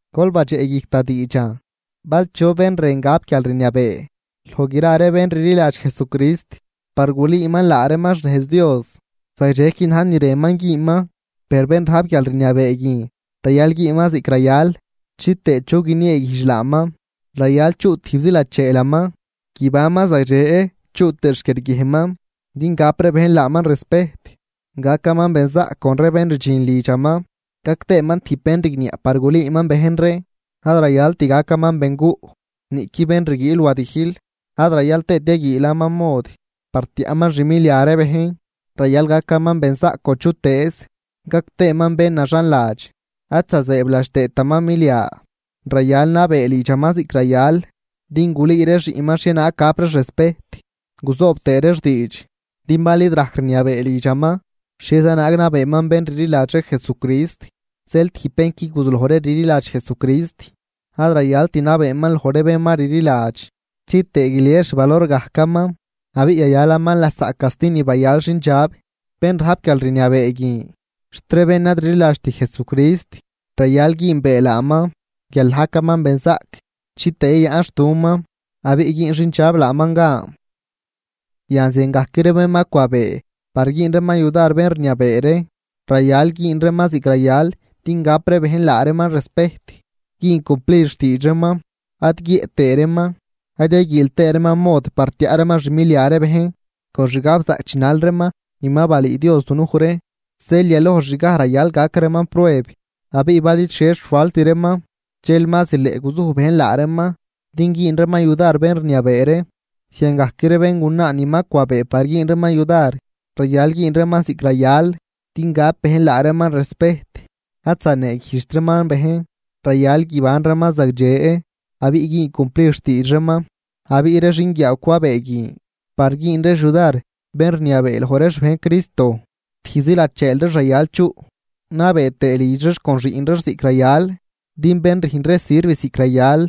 Gol badxeꞌguijc da diidxan: Bal chu bén rën gap guialrniabee loj gra ree bén rliladx Jesucrist par gulüüman laa reeman xnejz Dios, zagdxequi na̱j ni rënman güünman. Per bén rajp guialrniabee guin rayal güünman ziꞌc rayal chitëë chu guinieeguijdx laaman. Rayal chuꞌ tijbzi lacheelaman, guibanman zagdxe chuꞌ tëë xquiarguiejnman din gap ree bejn laaman respejt. Gacaman benzaꞌc con ree bén rdxin lidxaman, gac tëëman tijb bén rigniaꞌ par gulüüman bejn ree. Ad rayalt gacaman benguꞌ, niꞌqui bén rguiil wadijl ad rayal tëët yaguiilaman mod par tiaꞌman xmilia ree bejn, rayal gacaman benzaꞌc con chutëëz, gac tëëman bén naxanladx ad zazëëbladx tëëtaman milia. Rayal nabee lidxaman ziꞌc rayal din gulüü ree xiꞌnman xhienaag gap reex respejt guzoob tëë reex diidx. Din bal id rajc rniabee lidxaman, ¿xhieza naag nabeeman bén rliladx ree Jesucrist? Zeel tijb bén qui guzulojri rliladx Jesucrist, ad rayalt nabeeman loj ree bén ma rliladx chitëë guilies xvalor gajcaman abiꞌ yayalaman lasaꞌ casti ni bayal xindxab. Bén rajp guialrniabee guin xt ree bén ad rliladxt Jesucrist rayal güünbee laaman guial najcaman benzaꞌc chitëë yayaꞌnxtuman abiꞌ güün xindxab laaman gan. Yan ziangajc ree bén ma cwabee par güün reeman yudar bén rniabee ree, rayal güün reeman ziꞌc rayal din gap ree bejn laa reeman respejt, güün cumplid xtiidx reeman, ad guiëꞌ tëë reeman, ad yaguiil tëë reeman mod par tiaꞌ reeman xmilia ree bejn. Con xgabzaꞌc chinal reeman ni ma balüü Dios dunuj ree. Zeel yalojxgaj rayal gac reeman prueb abiꞌ bal id xhie xfalt reeman, dxel ma zileꞌ guzuj bejn laa reeman din güün reeman yudar bén rniabee ree. Ziangajc ree béngunaa ni ma cwabee par güün reeman yudar, rayal güün reeman ziꞌc rayal din gap bejn laa reeman respejt ad zaneeguijdxt reeman bejn, rayal guiban reeman zagdxe abiꞌ güün cumplid xtiidx reeman. Abiꞌ ree xinguiaaw cwabee guin par güün reex yudar bén rniabee loj ree xbejn Cristo, tijbzi lacheel reex rayal chuꞌ, nabee tëë lidx reex con xiꞌn reex ziꞌc rayal. Din bén rüjn ree sirv ziꞌc rayal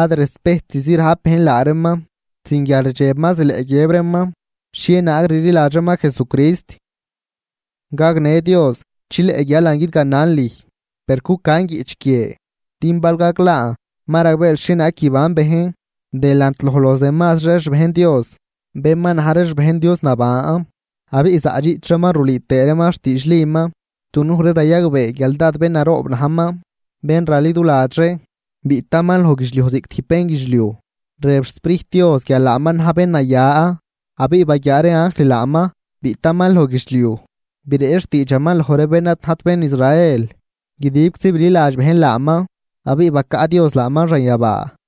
ad respejtzi rajp bejn laa reeman, sin guialrdxeb ma zileꞌ guiëb reeman xhienaag rliladx reeman Jesucrist. Gagnë Dios chileꞌ guialan guidganan lüj. Per cucan guiꞌch guie, din bal gaglaan ma ragbeel xhienaag guiban bejn delant loj los demasri ree xbejn Dios, bén ma na̱j ree xbejn Dios naban, abiꞌ zaꞌdxiꞌch reeman rulüü tëë reeman xtiidxliman. Dunuj ree rayagbee guial dád bén naroob najman, bén raliduladx ree: Biꞌtaman loj guidxliuj ziꞌc tijb bénguidxliuj, rëb xSprijt Dios guial laaman na̱j bén naya abiꞌ baguiaa ree anjl laaman biꞌtaman loj guidxliuj. Breꞌch xtiidxaman loj ree bén ad najt bén Israel, guidibczi bililadx bejn laaman abiꞌ bacaꞌ Dios laaman xanyabaa.